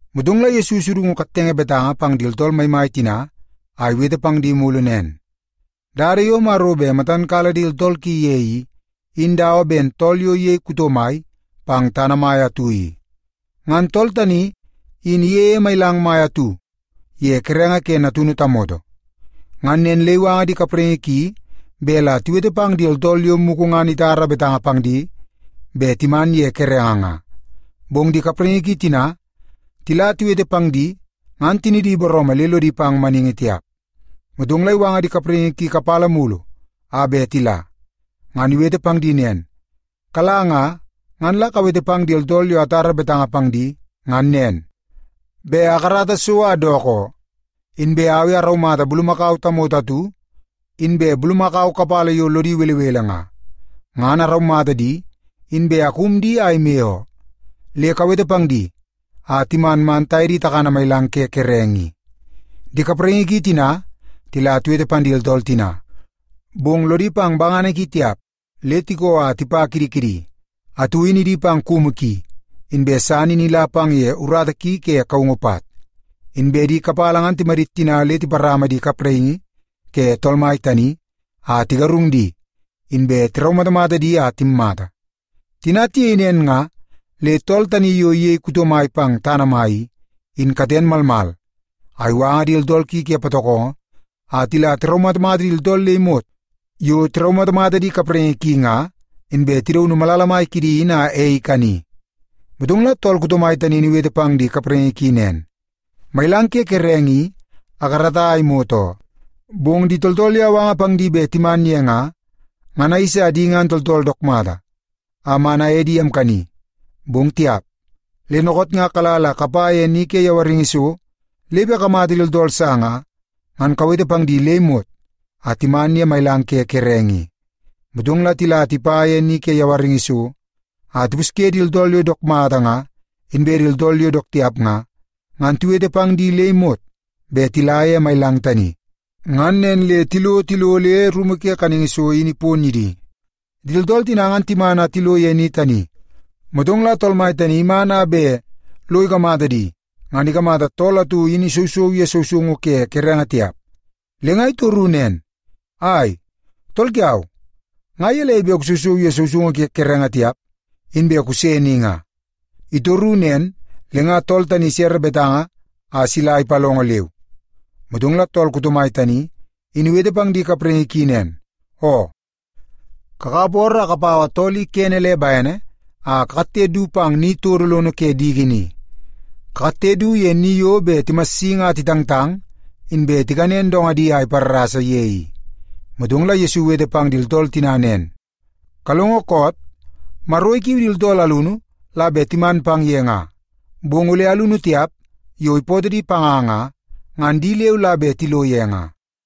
Motong la Yesu isudungu kattenge betanga pang di tooltool maimai tina a iwete pang di mulu nen, “Dada yo Maro be matan kala di tooltool ki ye i, in dawa ben tool yo iyei kuto mai pang tana mai atu i. Ngan tool tani in iyeie mailang mai atu ye kerenge ke natunu tamoto. Ngan nen le iwanga di kapraingi ki be la tiwete pang di tooltool yo muku ngan itara betanga pang di be timan ye kerenge nga. Bong di kapraingi ki tina tila tiwete pang di, ngan tinidi booroomoo le lodi pang maningi tiap. “Motong la iwanga di kapraingi ki kapala mulu a be tila, ngan iwete pang di nen, ‘Kala nga, ngan la kawete pang di tooltool yo atara betanga pang di ngan nen, be akarata so a dook oo. Inbe au i araumata bulumakau tamoto atu, inbe bulumakau kapala yo lodi welewele nga, ngan la araumata di inbe akum di a ime oo. Le kawete pang di a timan man taye di takana mailang ke kerenge i.’ “Di kapraingi ki tina tila tiwete pang di tooltool tina, bong lodi pang bangana ki tiap, le tikoo a tipa kidi kidi. Atu in idi pang kumu ki, inbe san in ila pang ye urata ki ke kaungu pat. Inbe di kapala ngan timadit tina le tiparama di kapraingi ke tool mai tani, a tigarung di, inbe tiraumatamata di a timmata. Tina tiyei nen nga, le tool tani yo iyei kuto mai pang tana mai i, in katen malmal a iwanga di tooltool ki ke patokongo a tila tiraumatamata di tooltool le imot yo tiraumatamata di kapraingi ki nga, inbe tidaunu malala mai kidi in a ei ikani. “Motong la tool kuto mai tani in iwete pang di kapraingi ki nen, ‘Mailang ke kerenge i akarata a imot oo, bong di tooltool yo awanga pang di be timan ye nga, ngan ayeisa di ngan tooltool dook mata a man aye di amkani, bong tiap. Le nookoot nga kala la kapa ye ni ke yawaringi so, le be kakamata di tooltool sa nga, ngan kawete pang di le imot a timan ye mailang ke kerenge i.’ Motong la tila tipa ye ni ke yawaringi so a tipuske di tooltool yo dook mata nga inbe di tooltool yo dook tiap nga, ngan tiwete pang di le imot be tila ye mailang tani. Ngan nen le tilo tilo le rumu ke kaningi so in ipon ye di. “Di tooltool tina timan a tilo ye ni tani, motong la tool mai tani iman a be lo ikamata di, ngan ikamata tool atu in isousou ye sousoungu ke kerenge tiap. Le nga itoru nen, ‘Ai, tool kiau, nga yelei be kusousou ye sousoungu ke kerenge tiap, inbe kuse ni nga?’ Itoru nen, le nga tool tani isere betanga a sila ipalongo leu. “Motong la tool kuto mai tani, in iwete pang di kapraingi ki nen, ‘Oo, kakap ooroo a kapau tool i kene le baene a kakatte du pang ni todo lono ke diki ni. Kakatte du ye ni yo be timassingi a titangtang inbe tikanen dongadi a iparrasa ye i.’” Motong la Yesu iwete pang di tooltool tina nen, “Kalongo koot? Maro ikiu di tooltool alunu la be timan pang ye nga, bong ole alunu tiap yo ipootoo di panga nga, ngan di leu la be tilo ye nga.”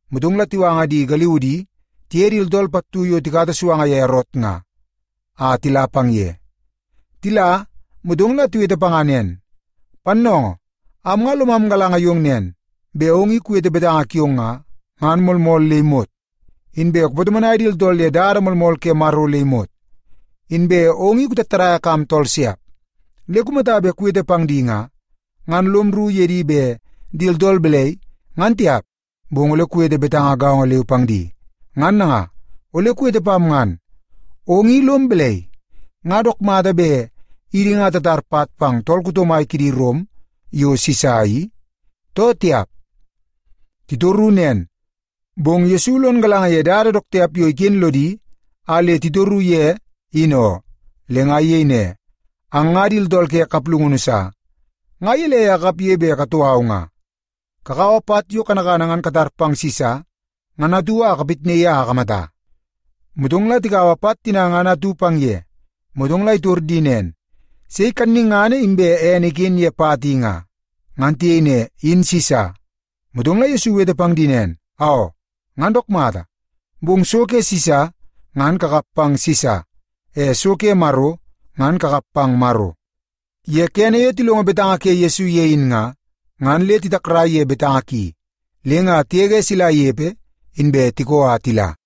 Motong la tiwanga di galiudi tiye di tooltool pattu yo tikata suanga ye Erot nga, a tila pang ye. Tila, motong la tiwete panga nen, “Pannoongoo, am nga lomam galanga yong nen, be ong i kuwete betanga kiong nga, ngan moolmool le imot. Inbe kupatomonai di tooltool ye dada moolmool ke Maro le imot. Inbe ong i kutattadaia kam tooltool siap. Le kumata be kuwete pang di nga, ngan lom rru ye di be di tooltool belei, ngan tiap, bong ole kuwete betanga gaongo leu pang di. Ngan nanga, ole kuwete pam ngan. Ong i lom belei? Nga dook mata be idi nga tatar pat pang tool kuto mai kidi Rom yo Sisa i, too tiap?” Titoru nen, bong Yesu lon galanga ye dada dook tiap yo iken lodi a le titoru ye in oo. Le nga iyei ne, “Ang nga di tooltool ke kaplungunu sa! Nga yelei a kakapye be katou au nga? Kakaua pat yo kanakana ngan tatar pang Sisa ngan atu a kapatnaii a akamata.” Motong la tikaua pat tina ngan atu pang ye. Motong la itor di nen, “Sei kanningana inbe ene iken ye pat i nga?” Ngan tiyei ne, “In Sisa.” Motong la Yesu iwete pang di nen, “Aoo, ngan dook mata! Be so ke Sisa, ngan kakap pang Sisa. E so ke Maro, ngan kakap pang Maro.” Ye kene yo tilongo betanga ke Yesu ye in nga, ngan le titakrai ye betanga ki. Le nga tiyege sila iyepe, inbe tikoo a tila.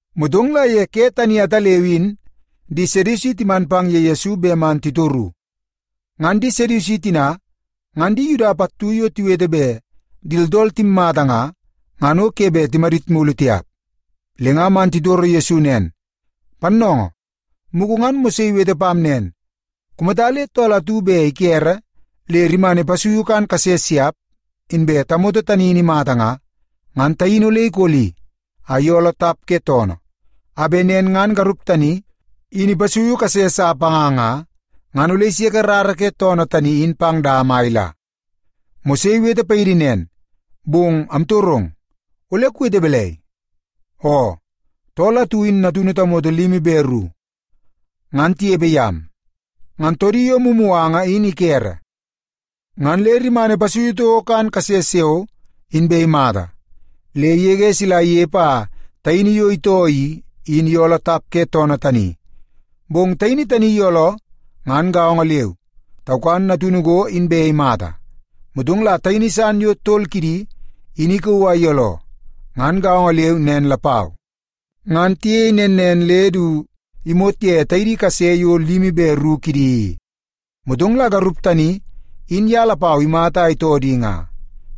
Motong la ye ke tani ataleu in di Sedusi timan pang ye Yesu be man titoru. Ngan di Sedusi tina ngan di Yuda pattu yo tiwete be di tooltool timmata nga, ngan o ke be timadit mulu tiap. Le nga man titoro Yesu nen, “Pannoongoo, muku ngan Mose iwete pam nen. Kumata le tool atu be ikere le rimana ipasuiu kan kase siap, inbe tamoto tani in imata nga, ngan taini ole ikoli a iyooloo tap ke toonoo, a be nen ngan garup tani in ipasui kase sa panga nga, ngan ole iseke rara ke toonoo tani in pang dama a ila. Mose iwete paidi nen, bong amtorong, ole kuwete belei? Oo, tool atu in natunu tamoto limi be ru, ngan tiyepe yam. Ngan toodi yo mumuanga in ikere, ngan le rimana ipasui touo kan kase siao, inbe imata. Le iyege sila iyepe a taini yo itoo i, in iyooloo tap ke toonoo tani. Bong taini tani iyooloo, ngan gaongo leu, taukan natunu go, inbe imata. Motong la taidi san yo tol kidi, in ikauu a iyooloo, ngan gaongo leu nen lapau. Ngan tiyei nen nen le du imot ye taidi kase yo limi be ru kidi i. Motong la garup tani in ya lapau imata a itoo di nga.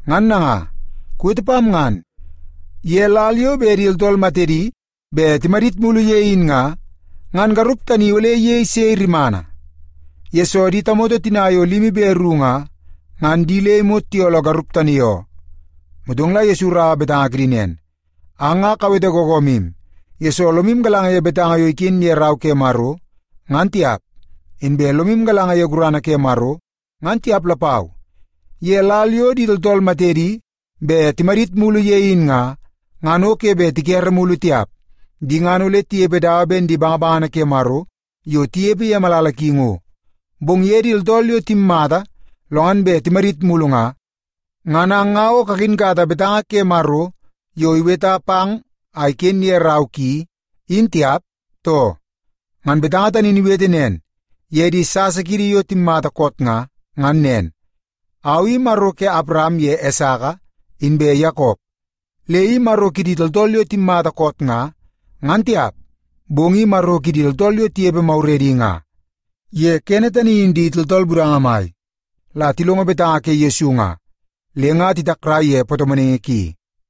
Ngan nanga, kuwete pam ngan, ye lal yo be di tooltool matedi be timadit mulu ye in nga, ngan garup tani ole iyei sei rimana? Yesoo, di tamoto tina yo limi be ru nga, ngan di le imot tiyooloo garup tani oo.” Motong la Yesu iraua betanga kidi nen, “Ang nga kawete gogomim, yesoo lomim galanga ye betanga yo iken ye Rau ke Maro, ngan tiap. Inbe lomim galanga ye gurana ke Maro, ngan tiap lapau. Ye lal yo di tooltool matedi be timadit mulu ye in nga, ngan o ke be tikere mulu tiap. Di ngan ole tiyepe dawa ben di bangabangana ke Maro yo tiyepe ye malala ki ngo. Bong ye di tooltool yo timmata lo ngan be timadit mulu nga, ngan ang nga o kakinkata betanga ke Maro yo iweta pang a iken ye rau, in tiap, too? Ngan betanga tani in iwete nen ye di sasa kiidi yo timmata koot nga, ngan nen, ‘Au i Maro ke Apram ye Esaka inbe Yakop.’ a Le i Maro kidi tooltool yo timmata koot nga, ngan tiap, bong i Maro kidi tooltool yo tiyepe mauredi nga.” Ye kene tani in di tooltool budanga mai la tilongo betanga ke Yesu nga, le nga titakrai ye patomonaingi ki.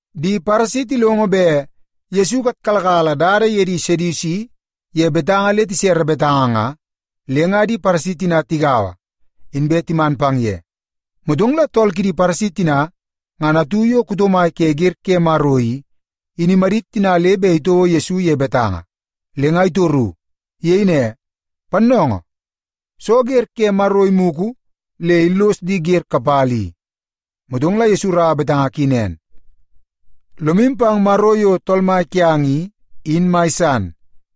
Di Paresi tilongo be Yesu ikatkalakala dada ye di Sedusi ye betanga le tisere betanga nga, le nga di Paresi tina tigaua, inbe timan pang ye. Motong la tool kidi Paresi tina ngan atu yo kuto mai ke ger ke Maro i, in imadit tina le be itouo Yesu ye betanga, le nga itoru. Iyei ne, “Pannoongoo, soo ger ke Maro imuku le illos di ger kapala i?” Motong la Yesu iraua torungu ki nen, “ ‘Lomim pang Maro yo Tool Mai kiang i, in mai san,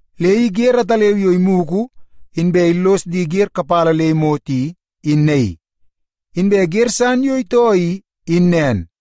Le i ger ataleu yo imuku inbe illos di ger kapala le imot i, in naii. Inbe ger san yo itoo i, in nen.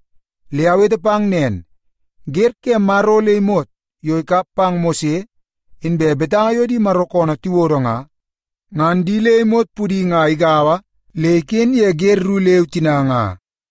Le awete pang nen, ger ke Maro le imot yo ikap pang Mose, inbe betanga yo di Maro koonoo tiwodo nga, ngan di le imot pudi nga igaua le iken ye ger ru leu tina nga.”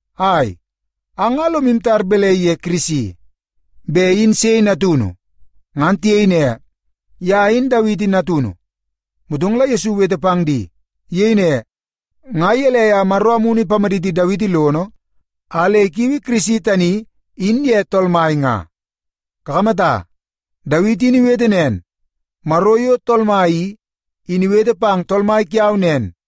“Ai, ang nga lomim tar belei ye Kirisi? Be in sei natunu?” Ngan tiyei ne, “Ya in Dawiti natunu.” Motong la Yesu iwete pang di. Iyei ne, “Nga yelei a Maro Amunu ipamaditi Dawiti lono a le ikiui Kirisi tani in ye Tool Mai nga? Kakamata, Dawiti in iwete nen, ‘Maro yo Tool Mai i, in iwete pang Tool Mai kiau nen,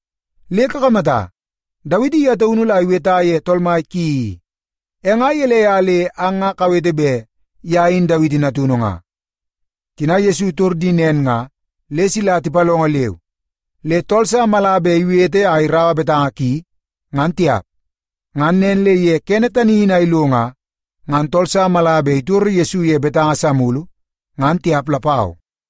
Le kakamata, Dawiti ya taunu la iweta ye Tool Mai ki i. E nga yelei a le ang nga kawete be ya in Dawiti natunu nga?” Tina Yesu itor di nen nga, le sila tipalongo leu. Le tool sa mala be iwete a iraua betanga ki, ngan tiap. Ngan nen le ye kene tani in a ilo nga, ngan tool sa mala be itoro Yesu ye betanga sa mulu, ngan tiap lapau.